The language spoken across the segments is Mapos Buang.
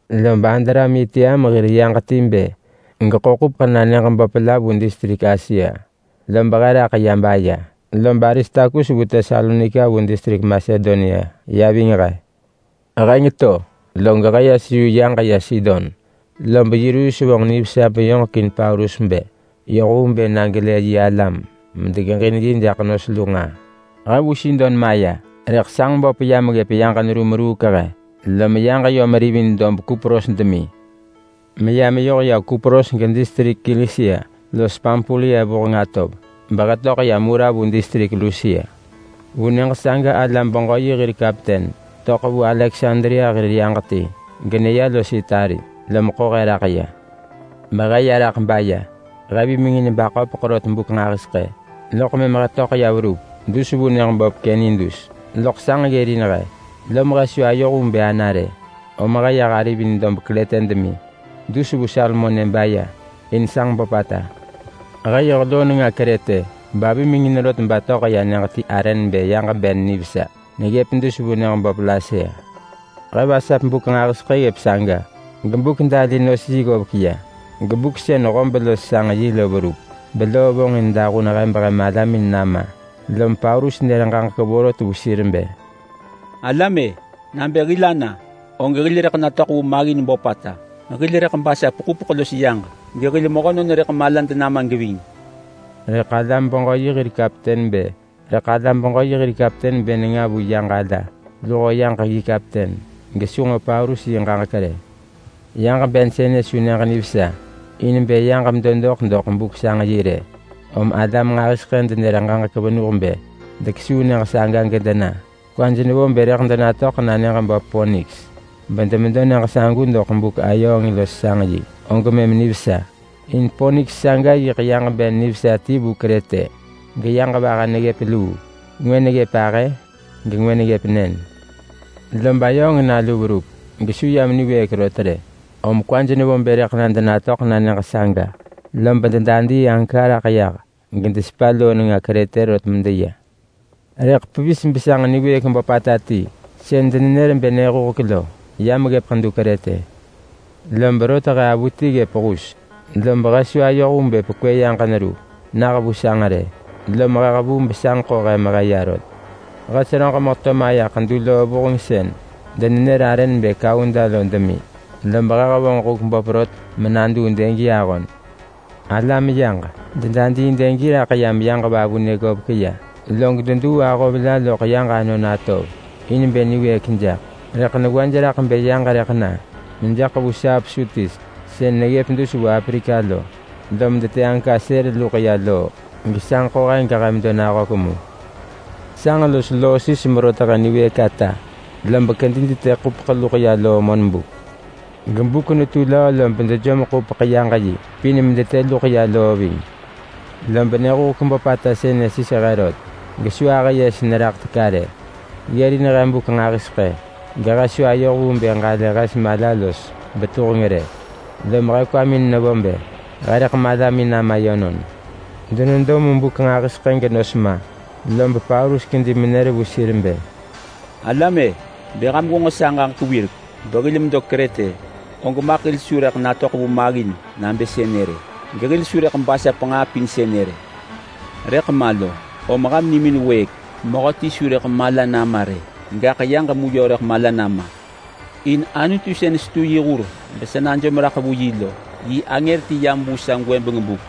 Lob Adramitiam hir yaġ ti bë geḳo ḳupeḳ na nyëġ böp la vu distrik Asia, lob he raḳ ya baya. Lob Aristarkus vu Tesalonika vu distrik Masedonia ya ving he. Heng to log he ya seyu yaġ ya Sidon, lob Yulius vonġ nivesa beyoġekin Paulus bë yoh vu bë na gelë yi alam medegeġin yi jaḳ nos lu nġaa. He vu Sidon maya, rëḳ sanġ böp yam ggëp yaġ neru meruuk he. Lom yaġ yom rivin dob Kupros demi meya meyoh ya Kupros gedistrik Kilisia los Pampulia vuheng atov, behe töḳ ya Mura vu distrik Lusia. Vu nyëġ saga alam-beġö-yi hir kapten töḳ vu Aleksandria hir yaġ ti geneya los Itali, lom ḳo he raḳ ya. Behe ya raḳ baya. He vimengin baköpeḳ rot buk nġahiseḳë, loḳ mëm he töḳ ya verup dus vu nyëġ böp Kenidus. Loḳ sanġ ggërin he, lom he su ayoh vu bë ana rë, om he yah arivin dob Krete demi dus vu Salmone baya, in sanġ böpata. He yoh loo nenga Krete bevimengin rot batöḳ ya nyëġ ti arë nebë Yag-ben-nivesa neggëp dus vu nyëġ böp Lasea. He vasap buk nġahiseḳë ggëp saga geBuk-dali-nos-yi-lo maya ggovek ya, gebuk sën hob los sanġ yi lo verup beloo vonġin dahun he behe malamin nama. Lom Paulus nër ġaġek vorot vu sir bë, “Alam-e! Nabë hil ana, og hil rëḳ natöḳ vu maggin böpata. Hil rëḳ basap ḳupeḳ los yaġ, gehil mehönon rëḳ malad nama geving.” Rëḳ alam-beġö-yi hir kapten bë nenga vu yaġ ala luho yaġ yi kapten, gesu nġo Paulus yi ġaġek rë. Yaġ ben sënë su nyëġ nivesa in bë yaġ medo doḳ doḳ buk sanġ yi rë, om alam nġahiseḳë denër ġaġek venuh bë dekesuu nyëġ saga gedena. Kwaj nevo bë rëḳ denatöḳ na nyëġ böp Poniks bedemedo nyëġ sagu doḳ buk ayööng los sanġ yi, og mëm nivesa. In Poniks saga yiḳ yaġ ben nivesa ti vu Krete, geyaġ vaha neggëp luu. Ngwë neggëp ahë, gengwë neggëp nën. Lob ayööng nalu verup gesu yam niwëëk rot rë, lob dekuung bë deyoh vu bë na denatöḳ na nyëġ saga. Lob dedadii anka raḳ yah gedesepa loo nenga Krete rot medeya. Rëḳ pevis besanġ niwëëk böpata ti sën denenër bë Nyëhuhek lo, yam ggëp ḳedu Krete. Lob rot he avuti ggëp hus bedu ya, lob he su ayoh vu bë pekwë yaġ neru nah vu sanġ rë, lom he hevuu besanġ ḳo he mehe ya rot. He seröġ meheto maya ḳedu loo vuheng sën denenër arë nebë Kauda lo demi. Lob he hevonġ huk böp rot menaduu dëgi ahon. Dedadii dëgi raḳ yam yaġ vavunë ggovek ya, log deduu aggis la loḳ yaġ anon atov in bë niwëëk jaḳ. Rëḳ newaj raḳ bë yaġ rëḳ na mejaḳ vu saap Surtis sën neggëp dus vu Aprika lo, lom detë anka sël luḳ ya loo gesanġ ḳo he gehe medo nahök mu. Sanġ los loo sis merot he niwëëk ata, lob kedi detë ḳupeḳ luḳ ya loo monbuk. Gebuk netu löö lob dejom ḳupeḳ yaġ yi pin raḳ nemaj medetë luḳ ya loo ving. Lob Nyëhuhek böpata sënë sis he rot gesu ahë yes neraḳ teka rë. Ggërin he buk nġahiseḳë gehe su ayoh vu bë ġalë hes mala los betuheng rë, lom he kwamin nevo bë rëḳ he malamin nama yönon. Denedo mu buk nġahiseḳë genos ma, lob Paulus kedi menër vu sir bë, “Alam-e, bë ham gwenġo sa ġaġek wirek behil medo Krete, og maḳ hil su rëḳ natöḳ vu maggin nabë sënë rë, gehil su rëḳ basap nġaa pin sënë rë. Rëḳ ma lo, om ham nimin wëëk! Mehöti su rëḳ mala nama rë, gaḳ yaġ mu yö rëḳ mala nama. In Anutu sën setu yi hur besa najom raḳ vu yi lo, yi angër ti yam vu sa gwëbeng buk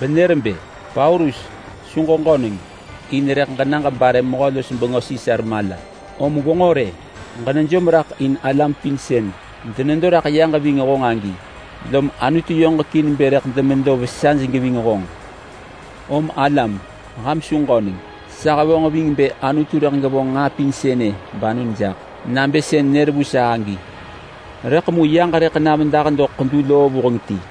benër bë, ‘Paulus, su ġeġöneng! In rëḳ ġena ġebare mehö-los-bengö Sisar mala. Om gwenġo rë! Ġenejom raḳ in alam pin sën denedo raḳ yaġ ving honġ agi, lom Anutu yoġekin bë rëḳ demedo vesaj geving honġ.’ Om alam! Ham su ġöneng! Sa hevonġ ving bë Anutu rëḳ gevonġ nġaa pin sënë banon jaḳ nabë sën nër vu sa agi. Rëḳ mu yaġ rëḳ na medah doḳ ḳedu loo vuheng ti.”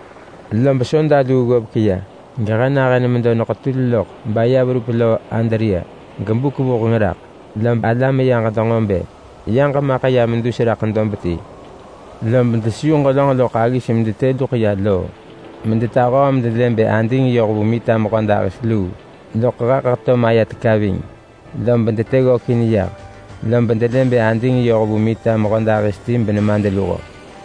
Lob soda luu ggovek ya gehe nahën medo neketul loḳ baya verup Loo Adria. Gebuk vuheng raḳ lob alam yaġ denġo bë yaġ maḳ ya medus raḳ dob ti. Lob deseyu ġelönġ loḳ aggis medetë luḳ ya loo medetahöö raḳ nemaj medelë bë ading yoh vu mehödahis ti. Loḳ heḳ heto maya teka ving lob detë ggökin yah, lob delë bë ading yoh vu nemadluho menemadvahi.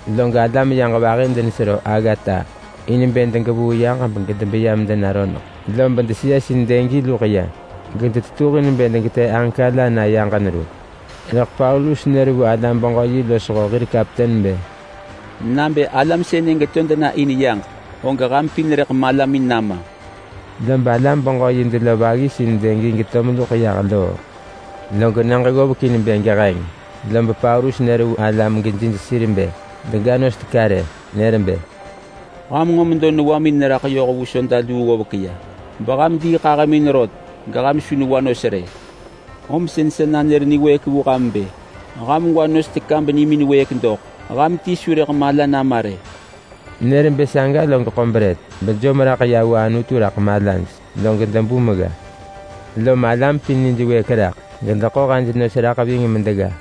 Log alam yaġ vahi denesero aggata in bë degevuu yaġ gedebeya medena roneḳ, lob deseyesin dëgi luḳ ya, gedetetuhin bë degetë anka la na yaġ neru. Rëḳ Paulus nër vu alam-beġö-yi losho hir kapten bë, “Nabë alam sënë geto dena in yaġ, og ham pin rëḳ malamin nama!” Lob alam-beġö-yi delov aggis in dëgi geto meluḳ ya loo. Log nyëġ ggovek in bë geheng, lob Paulus nër vu alam gejij sir bë dega nos teka rë. Nër bë, “Ham nġo medo newamin neraḳ yoh vu soda luu ggovek ya beham diiḳahëmin rot, geham su newa nos rë. Om sën sa nanër niwëëk vu ham bë ham gwa nos teka benimin wëëk doḳ. Ham ti su rëḳ mala nama rë!” Nër bë saga log ḳo brët bejom raḳ ya vu Anutu raḳ malaj, log debu megga. Lom alam pin nij wëëk raḳ gedeḳo hej nos raḳ ving medegga.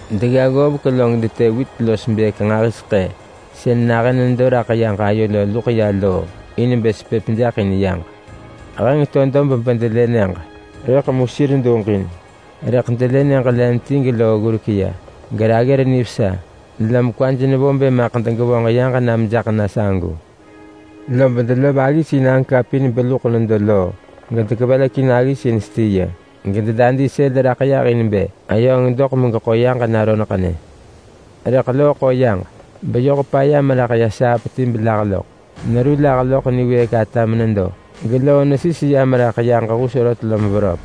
Degga ggovek log detë wit los bëëk nġahiseḳë sën nahën nedo loḳ yaġ ayo lo luḳ ya loo in bë sepëp jaḳ in yaġ. Heng to dob bedelë nyëġ, rëḳ mu sir duġin. Rëḳ delë nyëġ len ti geloo ggurek ya, geraggër nivesa, lom kwaj nevo bë maḳ degevonġ yaġ na mejaḳ na sagu. Lob delov aggis in anka pin beluḳ nedo loo gedekevelekin aggis in stiya. Gededadii sël raḳ yah in bë ayööng doḳ megeḳo yaġ na roneḳnë. Rëḳ loo ḳo yaġ beyoh paya meraḳ ya saap ti belah loḳ. Neru lah loḳ niwëëk ata menedo, geloo nesis ya meneraḳ yaġ hus rot lom veröp.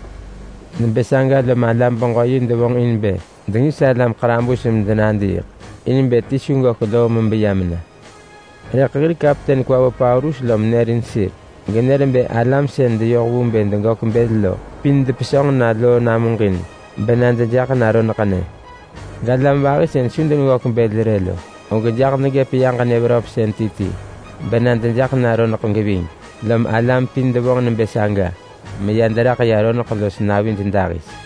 Nebë saga lob alam-beġö-yi devonġ in bë dengis alam ḳarabus medenadiiḳ, in bë ti su gök loo mebeya mena. Rëḳ hir kapten kwa vo Paulus lom nërin sir. Genër bë alam sën deyoh vu bë degök bël lo pin depesönġ na loo namuġin bena dejaḳ na roneḳnë. Galam vahi sën su deneggök bël rë lo, og jaḳ degëp yaġ nyë veröpsën ti ti bena dejaḳ na roneḳ geving. Lom alam pin devonġ nebë saga meya deraḳ ya roneḳ los navij dahis.